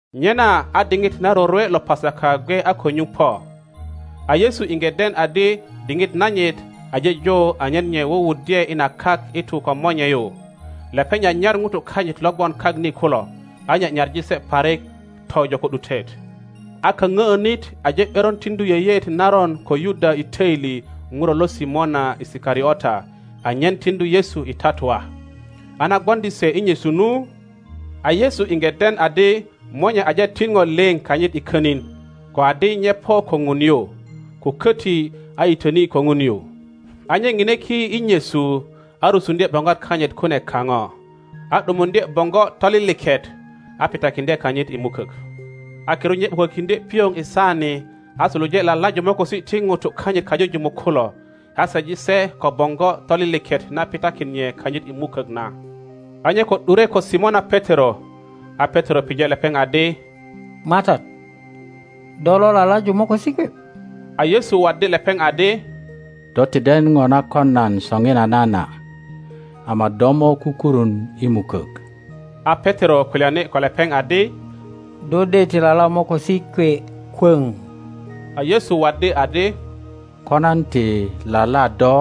Nyena a diŋit na rorwe lo Pasaka gwe a ko nyuŋ po. A Yesu iŋge den adi diŋit nanyit aje jo anyen nye wuwuddye i na kak i tu ko Monye yu. Lepeŋ nyanyar ŋutu kanyit lo gwon kak ni kulo, a nye nyaŋi se parik tojo ko ’dutet. A kaŋöönit aje ’beron tiŋdu yeyeet naron ko Yuda i töili ŋuro lo Simona Isikariota anyen tiŋdu Yesu i tatua. A na gwoŋdi se i nyesu nu, a Yesu iŋge den adi Monye aje tin ŋo liŋ kanyit i könin, ko adi nye po ko Ŋun yu, ko köti a yitöni ko Ŋun yu, a nye ŋine ki i nyesu, a rusuŋdye boŋgwat kanyit kune kaŋo, a ’dumuŋdye boŋgo toliliket, a pitakiŋdye kanyit i mukök; a kirut nye ’bukökiŋdye pioŋ i saani a suluje lalaju mokosi ti ŋutu kanyit kajujumuk kulo, a seji se ko boŋgo toliliket na pitakin nye kanyit i mukök na. A nye ko ’dure ko Simona Petero, a Petero pije lepeŋ adi, MATAT, do lo lalaju mokosi kwe? A Yesu waddi lepeŋ adi, Do ti den ŋo na kon nan soŋinana na, ama do mo kukurun i mukök. A Petero kulyani ko lepeŋ adi, Do de ti lala mokosi kwe kwöŋ! A Yesu waddi adi, Ko nan ti lala do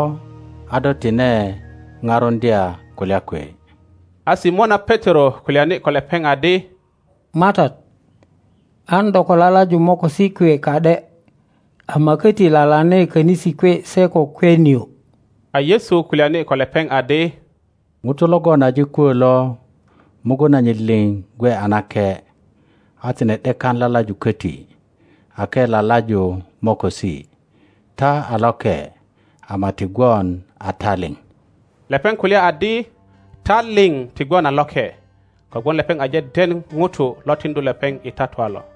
a do tine parundya kulya kwe. A Simona Petero kulyani ko lepeŋ adi, MATAT, an do ko lalaju mokosi kwe ka ’de, ama köti lalane könisi kwe se ko kwe nio. a Yesu kulyani ko lepeŋ adi, Ŋuto logon aje kwö lo, mugun nanyit liŋ gwe a nake, a tine ’dekan lalaju köti ake lalaju mokosi; ta a loke, ama ti gwon a ta liŋ. Lepeŋ kulya adi, Ta liŋ ti gwon a loke, kogwon lepeŋ aje den ŋuto lo tiŋdu lepeŋ i tatua lo.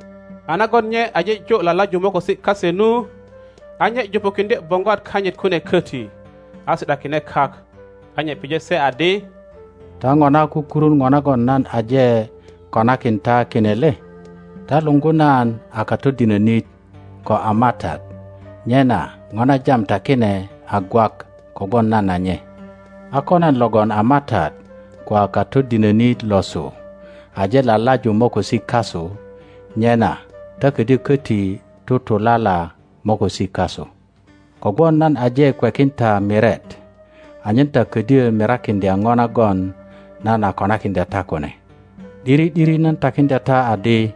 A nagon nye aje jo lalaju mokosi kase nu, a nye jupukiŋdye boŋgwat kanyit kune köti, a si ’dakine kak, a nye pije se adi, Ta ŋona kukurun ŋo nagon nan aje konakin ta kine le? Ta luŋgu nan a Katodinönit ko a MATAT, nyena ŋo na jam ta kine a gwak kogwon nan a nye. A ko nan logon a MATAT ko a Katodinönit losu aje lalaju mokosi kasu, nyena ta ködyö köti tutulala mokosi kasu. Kogwon nan aje kwekin ta miret, anyen ta ködyö mirakiŋdya ŋo nagon nan a konakiŋdya ta kune. ’Diri ’diri nan takiŋdya ta adi,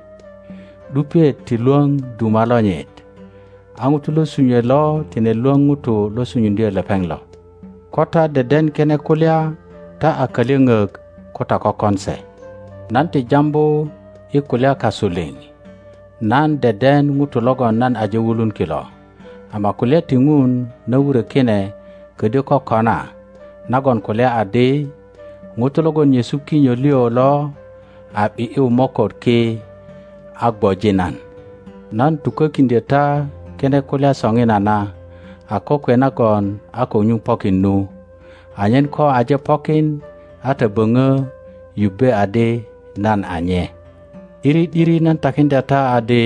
’dupiet ti lwöŋ duma lonyit, a ŋuto lo sunyue lo tine lwöŋ ŋuto lo sunyuŋdyö lepeŋ lo. Ko ta deden kine kulya ta a kalyöŋök ko ta kökon se. Nan ti jambu i kulya kasu liŋ. Nan deden ŋutu logon nan aje wulun kilo; ama kulya ti Ŋun na wurö kine ködyö kokona nagon kulya adi, Ŋuto logon nyesu kinyo liŋ lo a ’bi ’yu moköt ki a gwoji nan. Nan tukökiŋdyö ta kine kulya soŋinana a kokwe nagon a ko nyuŋ pokin nu, anye ko aje pokin a ta böŋö yubbe adi nan a nye. ’Diri ’diri nan takiŋdya ta adi,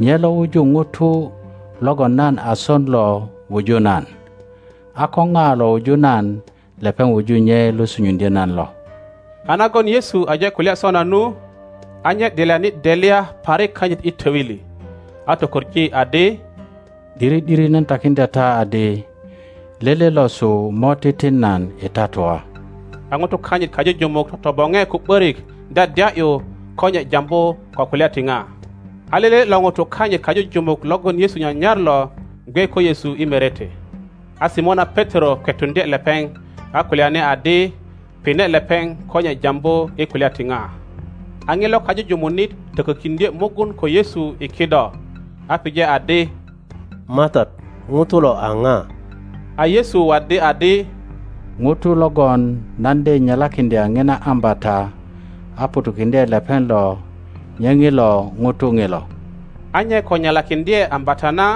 nye lo wuju ŋuto logon nan a son lo wuju nan, a ko ŋa lo wuju nan lepeŋ wuju nye lo sunyuŋdyö nan lo. A nagon Yesu aje kulya sona nu, a nye delyani delya parik kanyit i töili, a tokoŋ adi, ’Diri ’diri nan takiŋdya ta adi, lele losu mo titin nan i tatua. a ŋutu kanyit kajujumuk totoboŋe ko ’börik dyadya ’yu ko nye jambu ko kulya ti ŋa. A lele lo ŋutu kanyit kajujumuk logon Yesu nyanyar lo, gwe ko Yesu i merete. a Simona Petero kwetuŋdye lepeŋ, a kulyani adi, Pine lepeŋ ko nye jambu i kulya ti ŋa. A ŋilo kajujumunit tökökiŋdye mugun ko Yesu i kido, a pije adi, MATAT, ŋuto lo a ŋa? A Yesu waddi adi, Ŋuto logon nan de nyelakiŋdya ŋina ambata a ŋutukiŋdye lepeŋ lo, nye ŋilo ŋuto ŋilo. A nye ko nyelakiŋdye ambata na,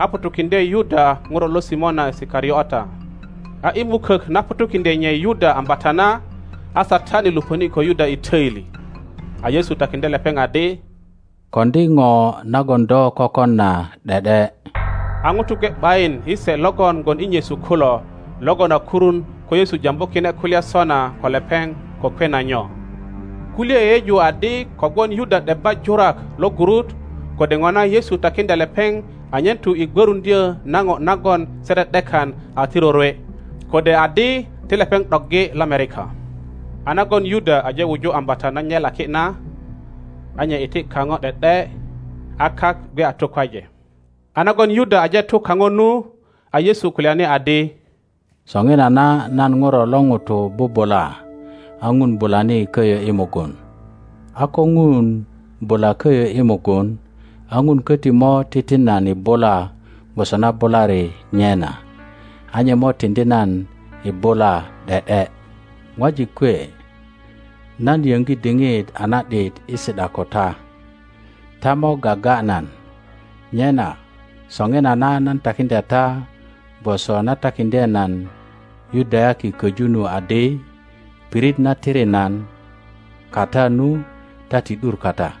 a ŋutukiŋdye Yuda ŋuro lo Simona Isikariota. A i mukök na ŋutukiŋdye nye Yuda ambata na, a Satani lupöni ko Yuda i töili. A Yesu takiŋdye lepeŋ adi, Koŋdi ŋo nagon do kökon na ’de ’de. A ŋuto gwe ’bayin i se logon gwon i nyesu kulo, logon a kurun ko Yesu jambu kine kulya sona ko lepeŋ ko kwe na nyo. Kulye yeyeju adi kogwon Yuda ’debba jurak lo gurut, kode ŋona Yesu takiŋdya lepeŋ anyen tu i gwöruŋdyö na ŋo nagon se ’de ’dekan a ti rorwe, kode adi ti lepeŋ ’doggi lomerika. A nagon Yuda aje wuju ambata na nyelaki na, a nye iti kaŋo ’de ’de. A kak gwe a tukwaje. A nagon Yuda aje tu kaŋo nu, a Yesu kulyani adi, Soŋinana nan Ŋuro lo ŋuto bubula, a Ŋun bulani köyö i mugun. A ko Ŋun bula köyö i mugun, a Ŋun köti mo titin nan i bula gwoso na bulari nye.na, a nye mo tiŋdi nan i bula ’de ’de. Ŋwajik kwe, nan yöŋgi diŋit a na ’dit i si ’da ko ta. Ta mo gaga nan, nyena, soŋinana nan takiŋdya ta gwoso na takiŋdye nan Yudayaki köju nu adi, Pirit na tiri nan kata nu ta ti ’dur kata.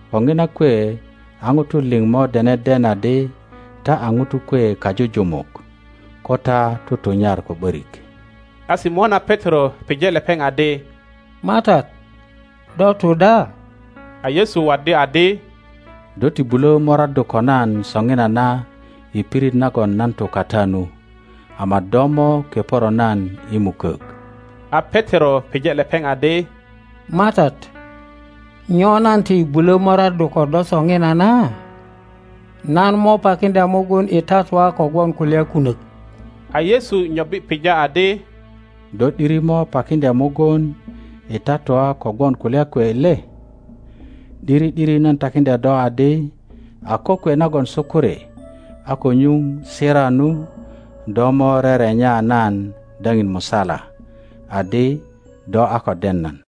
Ko ŋina kwe a ŋutu liŋ mo dene den adi ta a ŋutu kwe kajujumuk ko ta tutunyar ko ’börik. A Simona Petero pije lepeŋ adi, MATAT, do tu da? A Yesu waddi adi, Do ti bulö moraddu ko nan soŋinana i pirit nagon nan tu kata nu, ama do mo keporo nan i mukök. A Petero pije lepeŋ adi, MATAT, nyo nan ti bulö moraddu ko do soŋinana? Nan mo pakiŋdya muguni tatua kogwon kulya kunök. A Yesu nyobbi pija adi, Do ’diri mo pakiŋdya mugun i tatua kogwon kulya kwe le? ’Diri ’diri nan takiŋdya do adi, a kokwe nagon sukuri a ko nyuŋ sira nu, do mo rerenya nan daŋin musala adi do a ko den nan.